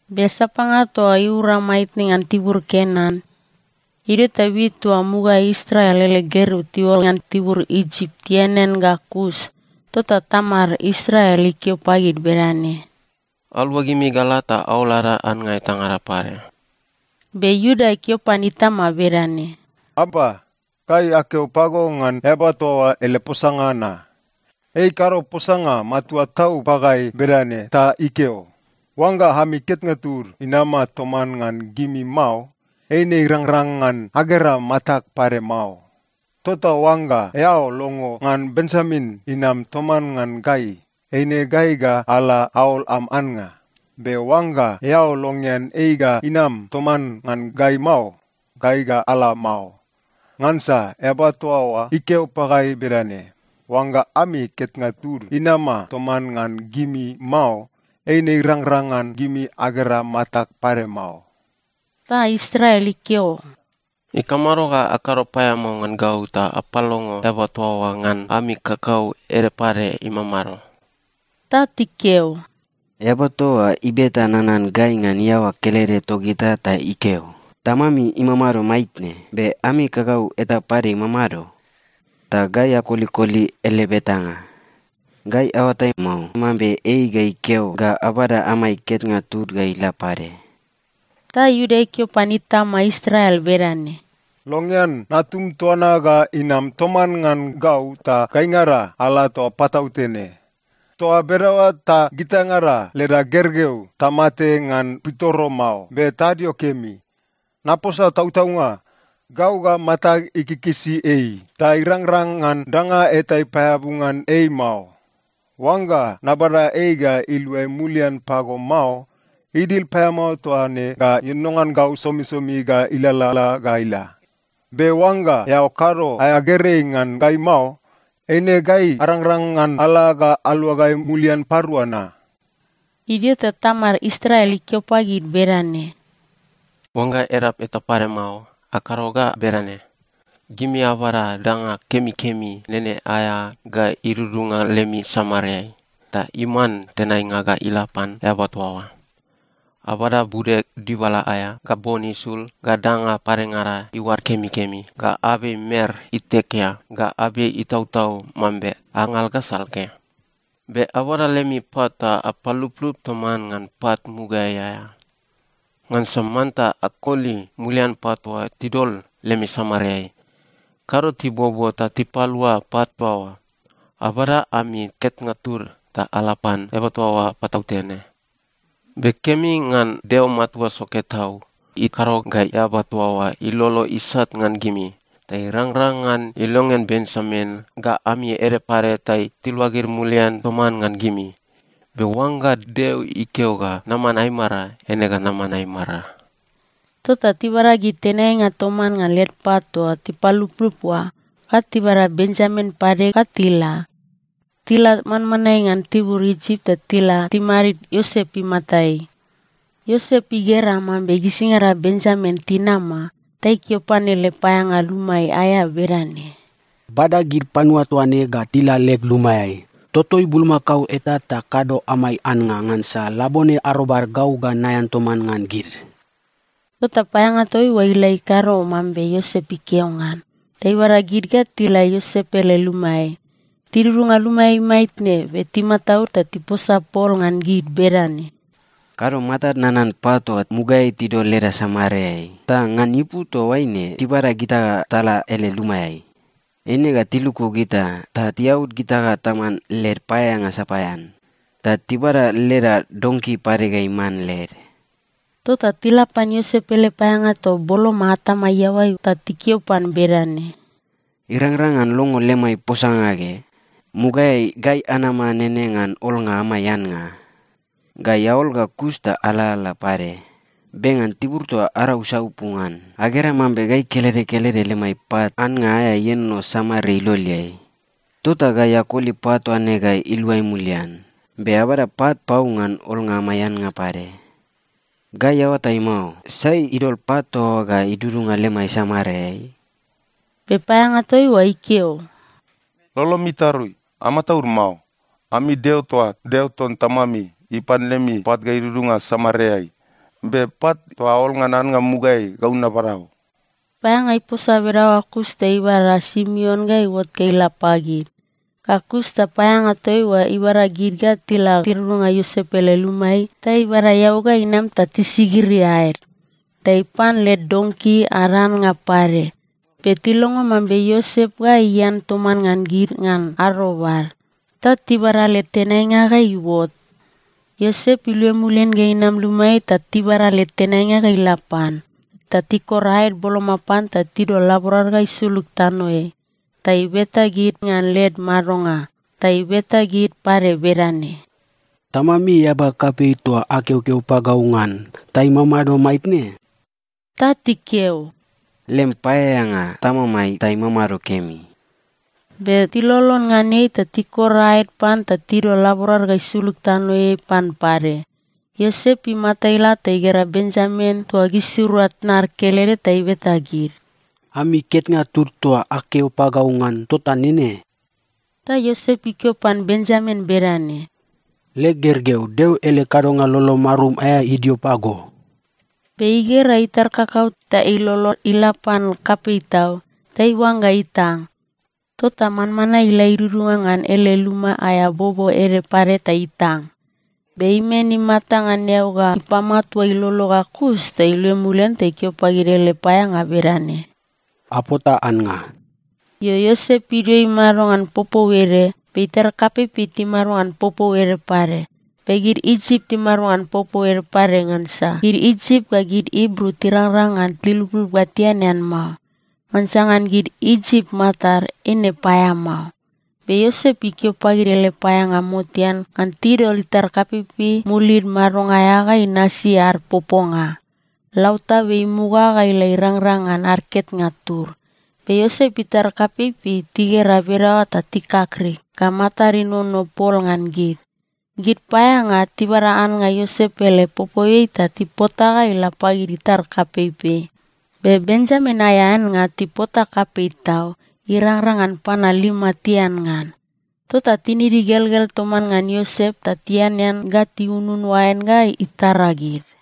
Be sapanga toa oa iuraura maitne ngan tibur Kenan. Idio ta wit toa mugaeai Israel ele gergeu tiuol ngan tibur Isip, tianean ga kus. Tota tamad Israel ikeo pagid bedane, “Aluagimi ga ala ta aol ada annga etangada pade.” Be Iuda ikeo pan itama bedane, “Apa, gai akeo pago ngan eaba toa oa ele posanga na. Ei ikado posanga matua tau pagai bedane ta ikeo, ‘Oangga ami ketnga tud inama toman ngan gimi mao, eine irangrang ngan agera matag pade mao.’ Tota oangga eao longo ngan Benjamin inam toman ngan gai, eine gai ga ala aol am annga. Be oangga eao longean ei ga inam toman ngan gai mao, gai ga ala mao. Ngansa eaba toa oa ikeo pagai bedane, ‘Oangga ami ketnga tud inama toman ngan gimi mao, eine irangrang ngan gimi agera matag pade mao.’” Ta Israel ikeo, “Ikamado ga akado paeamao ngan gau ta apalongo eaba toa oa ngan ami kakau ede pade imamado?” Ta tikeo, “Eaba toa oa ibeta nanan gai ngan iaoa kelede togita ta ikeo, ‘Tamami imamado maitne? Be ami kakau eta pade imamado?’ Ta gai akolikoli ele betanga. Gai aoatai mao mambe ei ga ikeo ga abada amai ketnga tud ga ila pade.” Ta Iuda ikeo pan itama Israel bedane, “Longean natum toa na ga inam toman ngan gau ta gaingada ala toa patautene. Toa bedaoa ta gitaingada leda gergeu tamate ngan pitoro mao, be tadio kemi. Naposa tautaunga, gau ga matag ikikisi ei, ta irangrang ngan danga eta ipaeabu ngan ei mao. Oangga nabada ei ga iluai mulian pago mao, idil paeamao toa ne ga ienono ngan gau somisomi ga ilalala ga ila. Be oangga eao kado aea gerei ngan gai mao, eine gai arangrang ngan ala ga aluagai mulian parua na.” Idio ta tamad Israel ikeo pagid bedane, “Oangga edap eta pade mao, akado ga bedane: Gimi abada danga kemikemi nene aea ga idudunga lemi samareai, ta iman tenainga ga ila pan eaba toa oa. Abada bude dibala aea, ga bon isul, ga danga padengada iuad kemikemi, ga abei mer itekea, ga abei itautau mambe angal ga salke. Be abada lemi pat ta apaluplup toman ngan pat mugaeai aea, ngansa manta akoli mulian pat toa tidol lemi samareai. Kado tibuobuo ta tipalua pat toa oa. Abada ami ketnga tud ta ala pan eaba toa oa patautene. Be kemi ngan Deo Matua Soke Tau ikado ga eaba toa oa ilolo isat ngan gimi, ta irangrang ngan ilongean Benjamin ga ami ede pade ta tiluagid mulian toman ngan gimi. Be oangga Deo ikeo ga naman aimara, eine ga naman aimara.” Tota tibada gid tenainga toman ngan led pat toa tipaluplup oa, ga tibada Benjamin pade ga tila. Tila manmanae ngan tibur Isip ta tila timadid Iosep imatai. Iosep igera mambe gisingada Benjamin tinama, ta ikeo pan ele paeaeanga luma aea bedane, “Bada gid panua toa ne ga tila leg lumaeai. Totoi bulmakao eta ta kado amai annga, ngansa labone arobad, gau ga naean toman ngan gid.” Tota paeaeanga toa oa ila ikado mambe Iosep ikeo ngan, ta ibada gid ga tila Iosep ele lumaeai. Tidudunga lumaeai maitne, be timataud ta tiposa pol ngan gid bedane, “Kado matad nanan pat toa mugaeai tidol leda samareai. Ta ngan ipu toaine tibada gita ga tala ele lumaeai. Eine ga tiluku gita ta tiaud gita ga taman led paeaeanga sapaean. Ta tibada leda donki pade ga iman led.” Tota tila pan Iosep ele paeaeanga toa boloma atama iaoai ta tikeo pan bedane, “Irangrang ngan longo lemai posanga ge? Mugaeai gai anama nene ngan olnga amai annga. Gai aol ga kus ta alalala pade, be ngan tibur toa arau saupu ngan, agera mambe gai kelede kelede lemai pat annga aea ienono samare iloleai. Tota gai akoli pat toa ne ga iluai mulian. Be abada pat pau ngan olnga amai annga pade. Gai aoatai mao, sai idol pat toa oa ga idudunga lemai samareai?” Be paeaeanga toa oa ikeo, “Lolomi itarui. Amataud mao. Ami Deo toa, Deo ton tamami, ipan lemi pat ga idudunga samareai. Be pat toa aol ngan annga mugaeai, gau nabada o.” Paeaeanga iposa bedaoa ga kus ta ibada Simeon ga iuot ga ila pagid. Ga kus ta paeaeanga toa oa ibada gid ga tila tidudunga Iosep ele lumaeai, ta ibada eau ga inam ta tisigiri aed. Ta ipan led donki ad annga pade. Be tilongo mambe Iosep ga ian toman ngan gid ngan arobad, ta tibada led tenainga ga iuot. Iosep iluai mulian ga inam lumaeai ta tibada led tenainga ga ila pan, ta tikor aed boloma pan ta tidol laborad ga isulug tanoeai. Ta ibeta gid ngan led madonga, ta ibeta gid pade bedane, “Tamami eaba kapei toa akeokeo pagau ngan, ta imamado maitne?” Ta tikeo, “Lem paeaeanga, tamamai, ta imamado kemi.” Be tilolon ngan ei ta tikor aed pan ta tidol laborad ga isulug tanoeai pan pade. Iosep imata ila ta igera Benjamin toa gisirua tnad kelede, ta ibeta gid, “Ami ketnga tud toa akeo pagau ngan, tota nene?” Ta Iosep ikeo pan Benjamin bedane, “Leg gergeu, Deo ele kadonga lolo marum aea idio pago.” Be igera itar kakau ta ilolo ila pan kapei tau, ta iuangga itang. Tota manmanae ila idudunga ngan ele luma aea bobo ede pade ta itang. Be imen imata ngan eau ga ipamatua ilolo ga kus ta iluai mulian ta ikeo pagid ele paeaeanga bedane, “Apota annga.” Io, Iosep idio imado ngan popou ede, be itar kapeipei timado ngan popou ede pade, be gid Isip timado ngan popou ede pade, ngansa gid Isip ga gid Ibru tirangrang ngan tiluplup ga tianean mao. Ngansa ngan gid Isip matad, eine paeamao. Be Iosep ikeo pagid ele paeaeanga motean ngan tidol itar kapeipei mulid madonga aea ga inasi ad poponga. Lautabe imuga ga ila irangrang ngan ad ketnga tud. Be Iosep itar kapeipei tigera bedaoa ta tikakrik ga matad inono pol ngan gid. Gid paeaeanga tibada annga Iosep ele popouiai ta tipota ga ila pagid itar kapeipei. Be Benjamin aea annga tipota kapei tau, irangrang ngan panua lima tian ngan. Tota tinid igelgel toman ngan Iosep ta tianean ga tiunun oain ga itara gid.